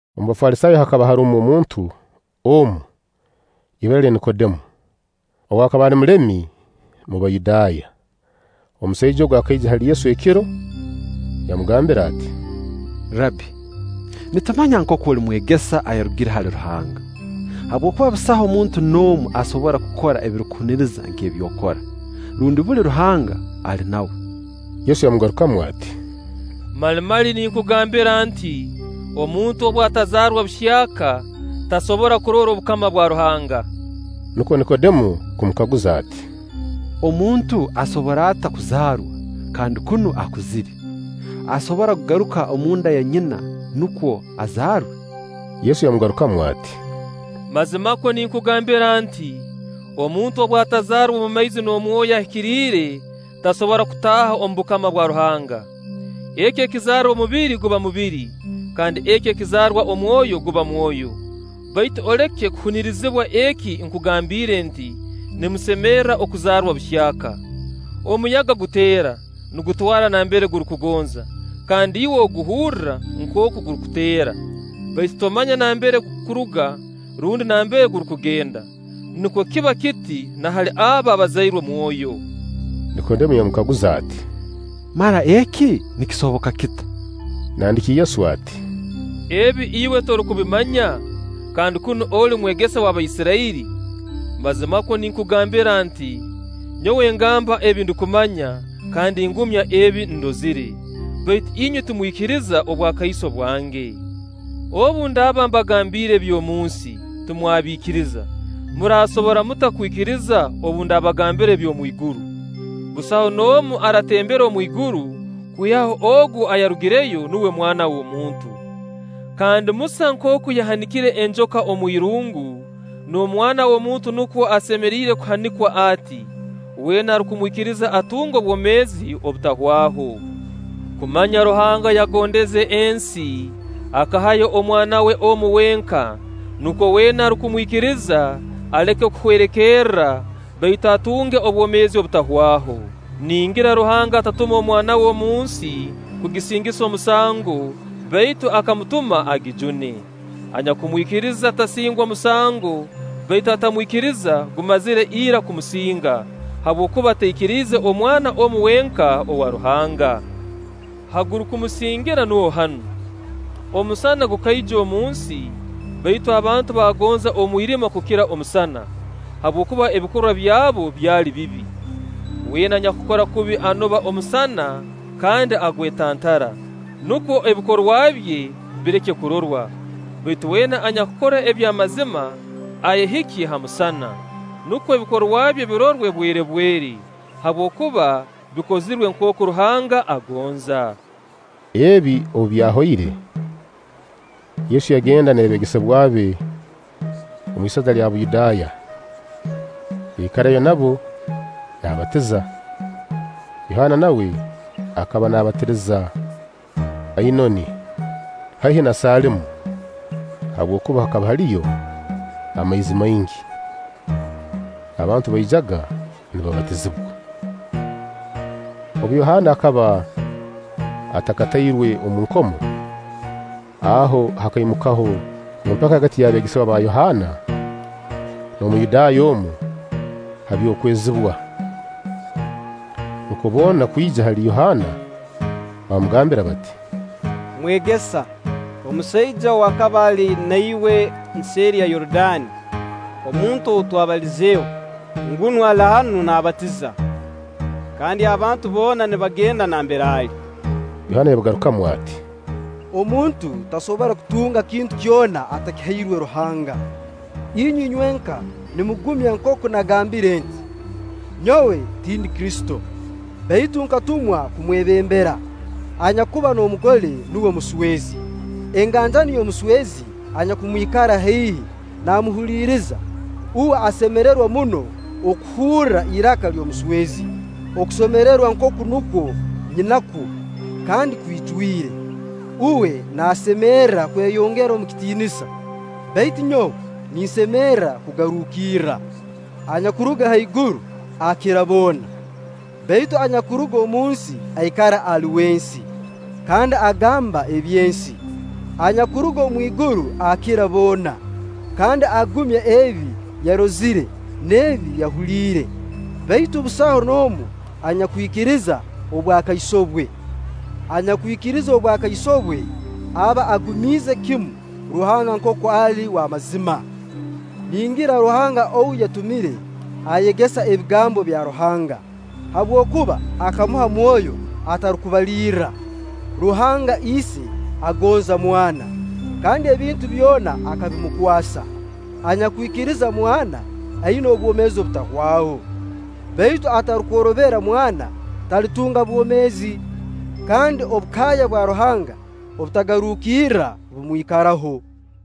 Omu Bafalisaayo hakaba harumu omuntu omu, ibara lye Nikodemo, ow'akaba ali mulemi mu Bayudaaya. Omusaija ogu akaija hali Yesu ekiro, yamugambira ati: “Rabbi, nitumanya nkooku oli mwegesa ayarugire hali Ruhanga; habwokuba busaho muntu n'omu asobora kukora ebihuniriza nk'ebi okora, rundi buli Ruhanga ali nawe.” Yesu yamugarukamu ati: “Mali mali ninkugambira nti: Omuntu obu atazaarwa buhyaka, tasobora kurora obukama bwa Ruhanga.” Nukwo Nikodemo kumukaguza ati: “Omuntu asobora ata kuzaarwa, kandi kunu akuzire? Asobora kugaruka omu nda ya nyina, nukwo azaarwe?” Yesu yamugarukamu ati: “Mazimakwo ninkugambira nti: Omuntu obu atazaarwa omu maizi n'omu Mwoyo Ahikiriire, tasobora kutaaha omu bukama bwa Ruhanga. Eki ekizaarwa omubiri guba mubiri, kandi eki ekizaarwa Omwoyo guba mwoyo. Baitu oleke kuhunirizibwa eki nkugambiire nti: ‘Nimusemerra okuzaarwa buhyaka.’ Omuyaga guteera, nigutwara nambere gurukugonza, kandi iwe oguhurra nkooku gurukuteera; baitu tomanya nambere gurukuruga rundi nambere gurukugenda. Nukwo kiba kiti na hali abo abazairwe Mwoyo.” Nikodemo yamukaguza ati: “Mara eki nikisoboka kita?” Nandiki Yesu ati: “Ebi iwe torukubimanya, kandi kunu oli mwegesa w'Abaisirairi? Mazimakwo ninkugambira nti: Nyowe ngamba ebi ndukumanya, kandi ngumya ebi ndozire; baitu inywe timwikiriza obwakaiso bwange. Obu ndaaba mbagambiire eby'omunsi, timwabiikiriza; muraasobora muta kwikiriza obu ndabagambira eby'omwiguru? Busaho n'omu aratembere omwiguru, kwihaho ogu ayarugireyo, nuwe Mwana w'omuntu. Kandi Musa nkooku yahanikire enjoka omwirungu, n'Omwana w'omuntu nukwo asemeriire kuhanikwa ati; weena arukumwikiriza atunge obwomeezi obutahwaho.” Kumanya Ruhanga yagondeze ensi, akahayo Omwana we omu wenka, nukwo weena arukumwikiriza aleke kuhwerekerra, baitu atunge obwomeezi obutahwaho. Ningira Ruhanga atatume Omwana we omunsi kugisingisa omusango; baitu akamutuma agijune. Anyakumwikiriza tasingwa musango; baitu atamwikiriza gumazire ira kumusinga, habwokuba taikiriize Omwana omu wenka owa Ruhanga. Ha gurukumusingira nuho hanu: omusana gukaija omunsi, baitu abantu baagonza omwirima kukira omusana, habwokuba ebikorwa byabo byali bibi. Weena anyakukora kubi anoba omusana kandi agwetantara, nukwo ebikorwa bye bireke kurorwa. Baitu weena anyakukora eby'amazima ayehikye ha musana, nukwo ebikorwa bye birorwe bwerebwere, habwokuba bikozirwe nkooku Ruhanga agonza. Ebi obu byahoire, Yesu yagenda n'abeegesebwa be omwisaza lya Buyudaaya; yaikarayo nabo naabatiza. Yohaana nawe akaba naabatiriza Ainoni haihi na Saliimu, habwokuba hakaba haliyo amaizi maingi. Abantu baijaga nibabatizibwa. Obu, Yohaana akaba atakatairwe omu nkomo. Aho hakaimukaho empaka hagati y'abeegesebwa ba Yohaana n'Omuyudaaya omu, ha by'okwezibwa. Nukwo boona kwija hali Yohaana baamugambira bati: “Mwegesa, omusaija ow'akaba ali na iwe nseeri ya Yorudaani, omuntu ou watubalizeeho, ngunu ali hanu naabatiza; kandi abantu boona nibagenda nambere ali.” Yohaana yabagarukamu ati: “Omuntu tasobora kutunga kintu kyona atakihairwe Ruhanga. Inywe inywenka nimugumya nkooku nagambire nti: Nyowe tindi Kristo, baitu nkatumwa kumwebembera. Anyakuba n'omugole nuwe muswezi; enganjani y'omuswezi anyakumwikara haihi naamuhuliriza, uwe asemererwa muno okuhurra iraka ly'omuswezi. Okusemererwa nk'oku nukwo nyinakwo, kandi kwijwire. Uwe naasemerra kweyongera omu kitiinisa, baitu nyowe ninsemerra kugarukirra.” Anyakuruga haiguru akira boona; baitu anyakuruga omunsi aikara ali w'ensi, kandi agamba eby'ensi. Anyakuruga omwiguru akira boona, kandi agumya ebi yarozire n'ebi yahuliire; baitu busaho n'omu anyakwikiriza obwakaiso bwe. Anyakwikiriza obwakaiso bwe aba agumiize kimu Ruhanga nkooku ali w'amazima. Ningira Ruhanga ou yatumire, ayegesa ebigambo bya Ruhanga, habwokuba akamuha Mwoyo atarukubalirra. Ruhanga Ise agonza Mwana, kandi ebintu byona akabimukwasa. Anyakwikiriza Mwana, aina obwomeezi obutahwaho; baitu atarukworobera Mwana, talitunga bwomeezi; kandi obukaya bwa Ruhanga obutagarukirra bumwikaraho.